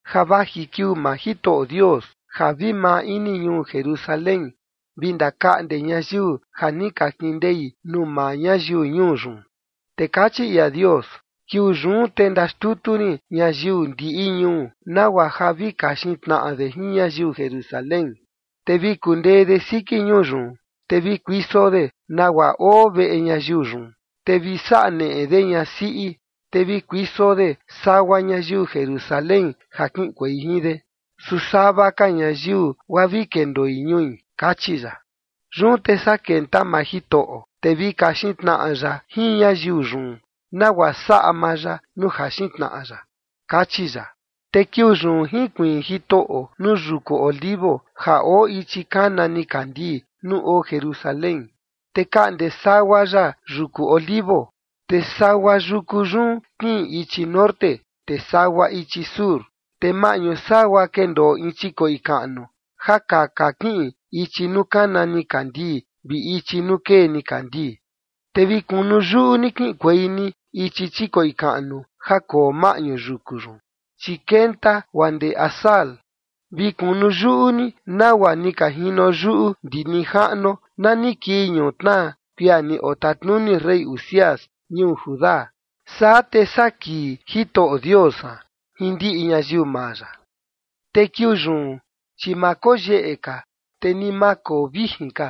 Ja vaji kiuu maa Jitoꞌo Dios ja vi maa ini ñuu Jerusalén vi ndakaꞌnde ñayiu ja ni ka kindei nuu maa ñayiu ñuu yun. Te kachi ia Dios: “Kiuu yun te ndaxtutu rin ñayiu ndiꞌi ñuu nagua ja vi kaxin tnaꞌa de jin ñayiu Jerusalén. Te vi kundee de siki ñuu yun, te vi kuiso de nagua oo veꞌe ñayiu yun, te vi saꞌa neꞌe de ñasiꞌi, te vi kuiso de sagua ñayiu Jerusalén, ja kiꞌinkuei jin de. Su sava ka ñayiu, guaa vi kendoi ñui”, kachi ya. Yun te saa kenta maa Jitoꞌo, te vi kaxin tnaꞌa ya jin ñayiu yun, nagua saꞌa maa ya nuu jaxin tnaꞌa ya, kachi ya. Te kiuu yun jinkuiin Jitoꞌo nuu yuku Olivo ja oo ichi kana nikandii nuu oo Jerusalén. Te kaꞌnde sagua ya yuku Olivo, te sagua yuku yun kiꞌin ichi norte, te sagua ichi sur, te maꞌñu sagua kendoo in chikoꞌi kaꞌnu ja kaka kiꞌin ichi nuu kana nikandii vi ichi nuu kee nikandii. Te vi kunu yuꞌu ni kiꞌinkuei ni ichi chikoꞌi kaꞌnu ja koo maꞌñu yuku yun, chi kenta guaa ndee Azal. Vi kunu yuꞌu ni nagua ni ka jino yuꞌu ndi nijaꞌnuo na ni kii ñutnaa kuia ni otatanuni rey Uzías ñuu Judá. Saa te saa kii Jitoꞌo Dios san jin ndiꞌi ñayiu maa ya. Te kiuu yun, chi ma koyeꞌe ka, te ni ma koo vijin ka,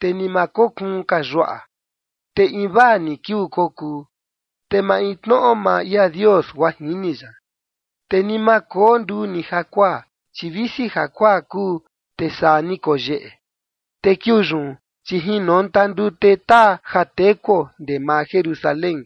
te ni ma kokuun ka yuaꞌa. Te invaa ni kiuu kokuu, te maintnoꞌo maa ia Dios guaa jini ya. Te ni ma koo nduu ni jakuaa, chi visi jakuaa kuu, te saa ni koyeꞌe. Te kiuu yun, chi jinonta ndute taa ja tekuo ndee maa Jerusalén,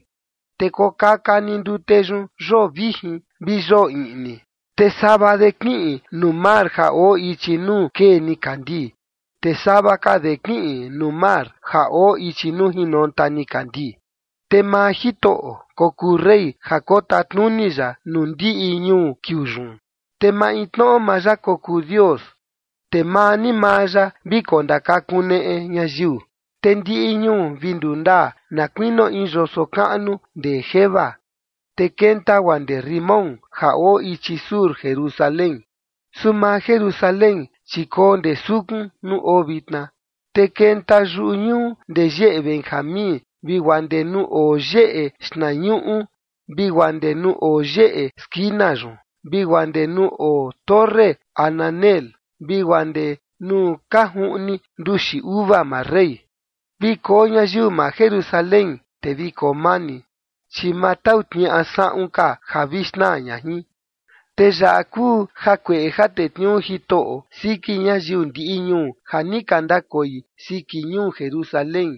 te kokaka ni ndute yun yoo vijin vi yoo iꞌni, te sava de kiꞌin nuu mar ja oo ichi nuu kee nikandii, te sava ka de kiꞌin nuu mar ja oo ichi nuu jinonta nikandii. Te maa Jitoꞌo kokuu rey ja kotatnuni ya nuu ndiꞌi ñuu kiuu yun, te maintnoꞌo maa ya kokuu Dios, te maa ni maa ya vi kondakakuneꞌe ñayiu. Te ndiꞌi ñuu vi ndundaa na kuinio in yoso kaꞌnu ndee Geba, te kenta guaa ndee Rimón ja oo ichi sur Jerusalén. Su maa Jerusalén, chi koo ndee sukun nuu oo vitna, te kenta yuꞌu ñuu ndee yeꞌe Benjamín vi guaa ndee nuu oo yeꞌe xtnañuꞌu vi guaa ndee nuu oo yeꞌe skina yun vi guaa ndee nuu oo torre Hananeel, vi guaa ndee nuu ka juꞌni nduxi uva maa rey. Vi koo ñayiu maa Jerusalén, te vi koo mani, chi ma tau tniaꞌa saꞌun ka ja vi xnaa ña jin. Te yaꞌa kuu jakueꞌe ja tetniuu Jitoꞌo siki ñayiu ndiꞌi ñuu ja ni ka ndakoi siki ñuu Jerusalén: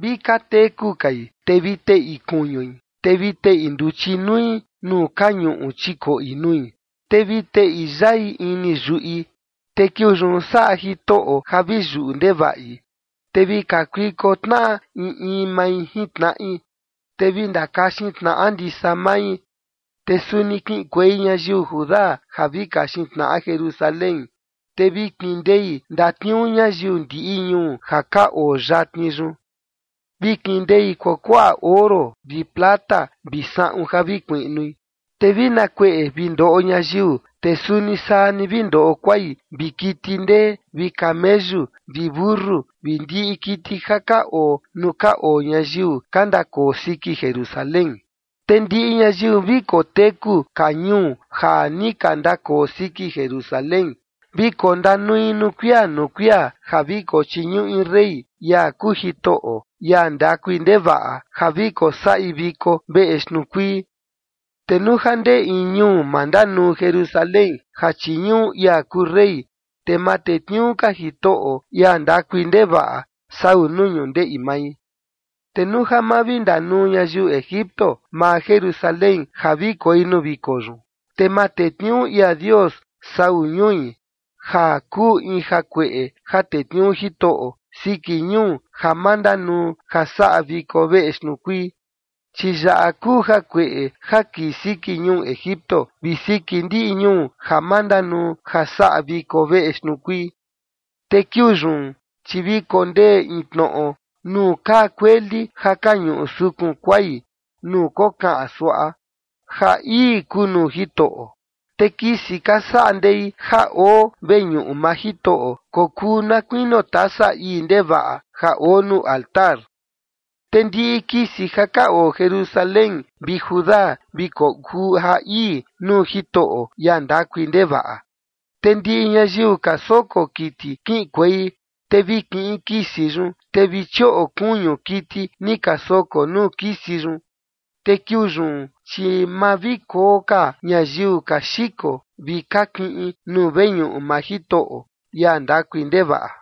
Vi ka teku kai, te vi teꞌi kuñui, te vi teꞌi nduchi nui nuu ka ñuꞌu chikoꞌi nui, te vi teꞌi yai ini yuꞌi. Te kiuu yun saꞌa Jitoꞌo ja vi yuꞌu ndevaꞌi, te vi kakuiko tnaꞌa in in mai jin tnaꞌi, te vi ndakaxin tnaꞌa ndisa mai. Te suni kiꞌinkuei ñayiu Judá ja vi kaxin tnaꞌa Jerusalén, te vi kindei ndatniuu ñayiu ndiꞌi ñuu ja ka oo yatni yun. Vi kindei kuakuaꞌa oro vi plata vi saꞌun ja vi kuiꞌnui. Te vi na kueꞌe vi ndoꞌo ñayiu, te suni saa ni vi ndoꞌo kuai vi kiti ndee vi kameyu vi mentu vi ndiꞌi kiti ja ka oo nuu ka oo ñayiu ka ndakoo siki Jerusalén. Te ndiꞌi ñayiu vi koteku ka ñuu ja ni ka ndakoo siki Jerusalén, vi kondanui nuu kuia nuu kuia ja vi kochiñuꞌi rey, ia kuu Jitoꞌo, ia ndakui ndevaꞌa, ja vi kosaꞌi viko veꞌe xtnuu kuii. Te nuu ja ndee in ñuu ma ndanuu Jerusalén ja chiñuꞌu ia kuu rey, te ma tetniuu ka Jitoꞌo, ia ndakui ndevaꞌa, sau nuu ñundeꞌi mai. Te nuu ja ma vi ndanuu ñayiu Egipto maa Jerusalén ja vi koi nuu viko yun, te ma tetniuu ia Dios sau ñui, ja kuu in jakueꞌe ja tetniuu Jitoꞌo siki ñuu ja ma ndanuu ja saꞌa viko veꞌe xtnuu kuii. Chi yaꞌa kuu jakueꞌe ja kii siki ñuu Egipto vi siki ndiꞌi ñuu ja ma ndanuu ja saꞌa viko veꞌe xtnuu kuii. Te kiuu yun, chi vi kondee in tnoꞌo nuu kaa kueli ja ka ñuꞌu sukun kuai nuu kokaꞌan suaꞌa: “Ja ii kuu nuu Jitoꞌo”. Te kisi ka saꞌa ndei ja oo veñuꞌu maa Jitoꞌo kokuu na kuinio tasa ii ndevaꞌa ja oo nuu altar. Te ndiꞌi kisi ja ka oo Jerusalén vi Judá vi kokuu ja ii nuu Jitoꞌo, ia ndakui ndevaꞌa. Te ndiꞌi ñayiu ka soko kiti kiꞌinkuei, te vi kiꞌin kisi yun, te vi chioꞌo kuñu kiti ni ka soko nuu kisi yun. Te kiuu yun, chi ma vi koo ka ñayiu ka xiko vi ka kiꞌin nuu veñuꞌu maa Jitoꞌo, ia ndakui ndevaꞌa.